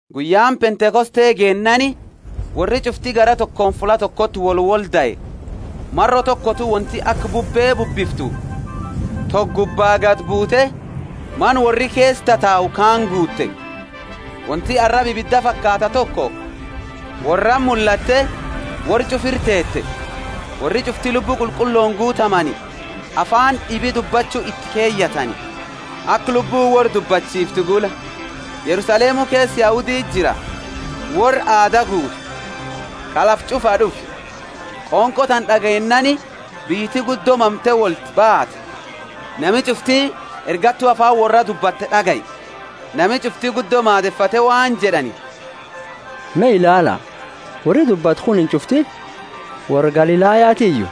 Guyyaani Pentekoste geennaani, worri ch'ufti garaa tokooni fulla tokoti wolwoldae. Maro tokotu wonti aka bubbe bubbiftu toko gubba gadi buute mana worri keesa tatau kaani guutte. Wonti araba ibida fakaatta toko worrati mullatte worra ch'ufa ira teete. Worri ch'ufti Lubbu Qulqullooni guutamnaani, afaani d'ibi dubbachu iti keyatani, aka Lubbuuni worra dubbachifte gula. Yerusalemu keesa Yahuditi jira, worra aada guutu, ka lafa ch'ufaa d'ufe. Qonqo tana d'ageennaani biyyiti guddo mamte wolti baate, nami ch'ufti ergattu afaani worraa dubbattu d'agaye. Nami ch'ufti guddo maadefate waan jed'ani, Me ilaala, worri dubbatu kunini ch'ufti worra Galilayatiyu?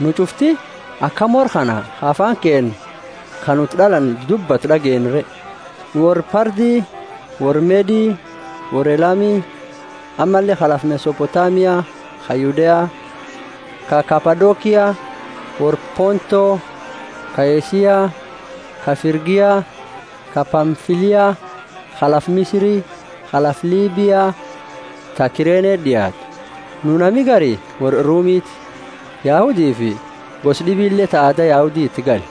Nu ch'ufti akami worra kana ka afaani keenna ka nu iti d'alanne dubbatu d'ageenna re? Nu worra Parthi, worra Medi, worra Elami; ammalle ka lafa Mesopotamia, ka Yudea, ka Kapadokia; worra Ponto, ka Asia, ka Frigia, ka Pamfilia, ka lafa Misiri, ka lafa Libia ta Kirene d'iaattu. Nu nami gari worra Rumiti, Yahudifi gosa d'ibile ta aada Yahudi iti gale;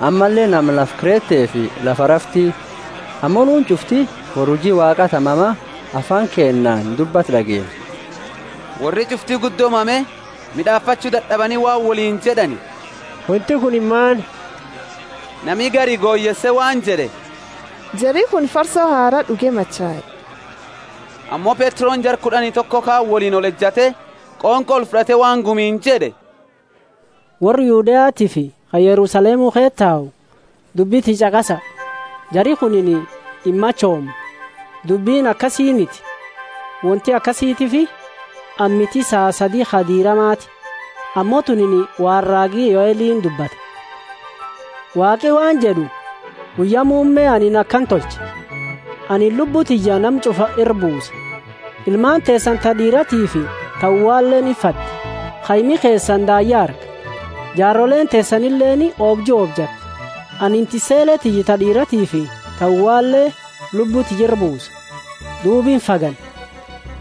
ammalle nama lafa Kretefi lafa Arafti — ammo nuuni ch'ufti worra huji Waaqa ta mama afaani keennaani dubbatu d'ageenna! Worri ch'ufti guddo mame, mid'aafachu dad'abani waan woliini jed'ani, Wonti kunini maani? Nami gari goyeese waan jed'e, Jari kunini farso haraa d'uge machae. Ammo Petroni jara kud'ani toko kaani woliini olejate qonqo olfud'ate waan gumiini jed'e, Worra Yudeatiifi ka Yerusalemu ke tau, dubbi tiyya ch'aqasa. Jari kuni imachoomne, dubbini akasiiniti; wonti akanatiifi ammiti saa sadi ka diiramaati. Ammo tunini waan raagi Yoelini dubbate, Waaqi waan jed'u, Guyya muumme anini akana tolcha: Anini Lubbu tiyya nama ch'ufa ira buusa; ilmaani teesani ta d'iiratifi ta uwaleeni imfaddi, kaimi keesani daayya arga, jaaroleeni teesanileeni oobju oobjatti. Anini tissele tiyya ta d'iiratifi ta uwale Lubbu tiyya ira buusa, duuba imfagani.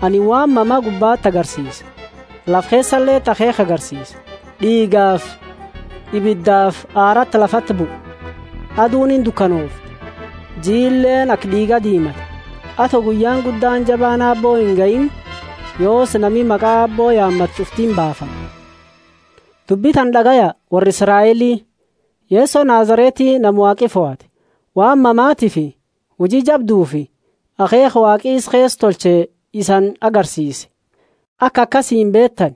Anini waan mama gubbati agarsiise, lafa keesaleti akheekha agarsiisa: D'iigafi ibidafi aarati lafati bua. Aduuni indukanoofti, jiileeni aka d'iiga diimata, ato guyyaani guddaani jabaani Aabbo ingahiini. Yoosi nami maqa Aabbo yaamatu ch'ufti imbaafama. Dubbi tana d'agaya, worra Israeli! Yeso Nazareti, nama Waaqi fohate, waan mamatiifi huji jabdufi akheekha Waaqi isa keesa tolcheeni isani agarsiise, aka isani beetani,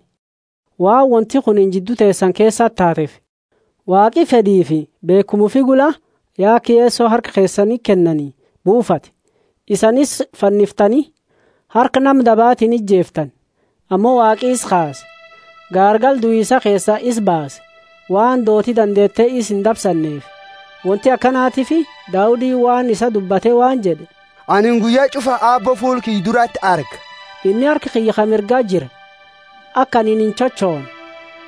waan wonti kunini jiddu teesani keesa taateefi. Waaqi, fed'ifi beekhuma ufi gula, ya aka Yeso harka keesaniti kennani buufate; isani isa fanniftani, harka nama dabaatiini ijeeftani. Ammo Waaqi isa kaase, gaargala duisa keesaa isa baase, waan dooti dandeete isa indabsanneefi. Wonti akanatiifi Daudini waan isaa dubbate waan jed'e, Anini guyya ch'ufa Aabbo fuula kiyya durati arga, inni harka kiyya ka mirga jira, aka anini inchochoone.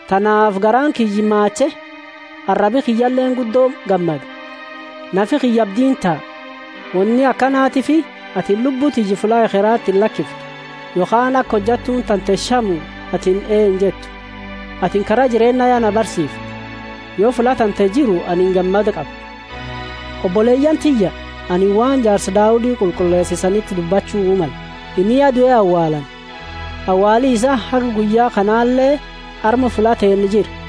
Tanaafi garaani kiyya maache, arabi kiyyaleeni guddo gammada; nafi kiyya abdiini taa. Woni akanatiifi atini lubbu tiyya fulla ekherati illakiftu, yokhaani aka hojattuuni tante shamu atini ee injettu. Atini kara jireenna ya na barsiifte, yo fulla tante jiru anini gammada qabu. Oboleyaani tiyya, anini waan jaarsa Daudi qulqulleese isaniti dubbachu male. Inni ya due awaalani, awaali isaa haga guyya kanale arma fulla teenna jira.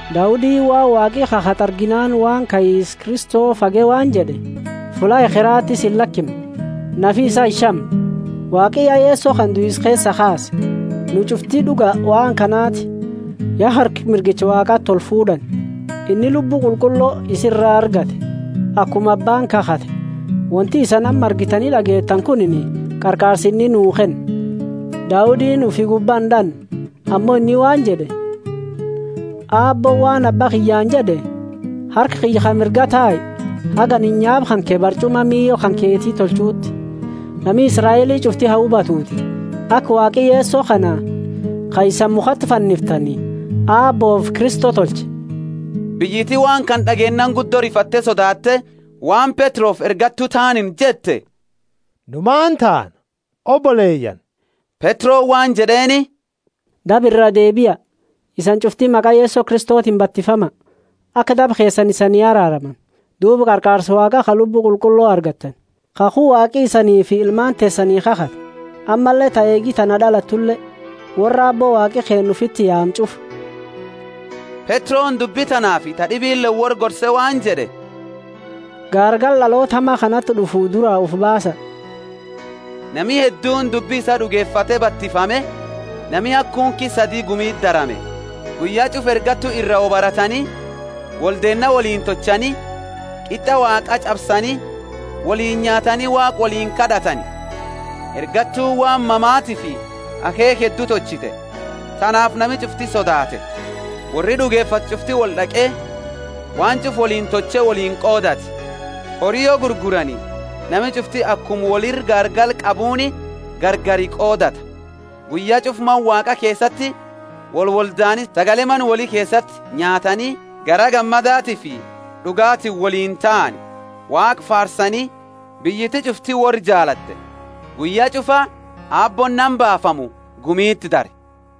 Daudini, waan Waaqi kakhate arginaani waan kaisa Kristo fage waan jed'e, Fulla ekherati isa illakimne, nafi isaa inshamne. Waaqi ya Yeso kana duisa keesaa kaase, nu ch'ufti d'uga waan kanaati. Ya harka mirgicha Waaqati olfuud'ani, inni Lubbu Qulqullo isa ira argate, akuma Abbaani kakhate; wonti isani amma argitani d'ageettani kunini qarqaarsa inni nuu kenne. Daudini ufi gubba ind'anne, ammo inni waan jed'e, Aabbooni waan Abba kiyyaani jed'e, Harka kiyya ka mirga tai, haga anini nyaapa kanke barch'uma miila kanketi tolchuuti. Nami Israeli ch'ufti ha hubatuuti, aka Waaqi Yeso kana ka isani mukhati fanniftani Aabboofi Kristo tolche! Biyyiti waan kana d'ageennaani guddo rifatte sodaatte waan Petrofi ergattu taaniini jette, Nu maani taana, oboleyaani? Petroni waan jed'eeni, Daba iraa deebia, isaniini ch'ufti maqa Yeso Kristotiini batifama, aka daba keesani isanii araaramani; duuba qarqaarsa Waaqa ka Lubbu Qulqullo argattani. Kakhu Waaqa isanifi ilmaani teesani kakhatani, ammalle ta eegi tana d'alattule — worra Aabbo Waaqi keenna ufiiti yaamu ch'ufa. Petroni dubbi tanaafi ta d'ibileeni worra gorse waan jed'e, Gaargala d'aloota hama kanati d'ufu duraa ufi baasa! Nami hedduuni dubbi isaa d'ugefate batifame, nami haga kunki sadi gumiti darame. Guyya ch'ufa ergattu ira wo baratani, woldeenna woliini tolchani, qit'a Waaqa ch'absani, woliini nyaatani Waaqa woliini kad'atani. Ergattuuni waan mamatiifi akheekha heddu tolchite, tanaafi nami ch'ufti sodaate. Worri d'ugefate ch'ufti wold'aqe waan ch'ufa woliini tolche woliini qoodate. Hori yo gurgurani nami ch'ufti akuma woli ira gaargala qabuuni gargari qoodata. Guyya ch'ufa Mana Waaqa keesati wolwoldaani sagale mana woli keesati nyaatani garaa gammadatiifi d'ugaatini woliini taani, Waaqa faarsani, biyyiti ch'ufti worra jaalatte. Guyya ch'ufa Aabbooni nama baafamu gumiti dare.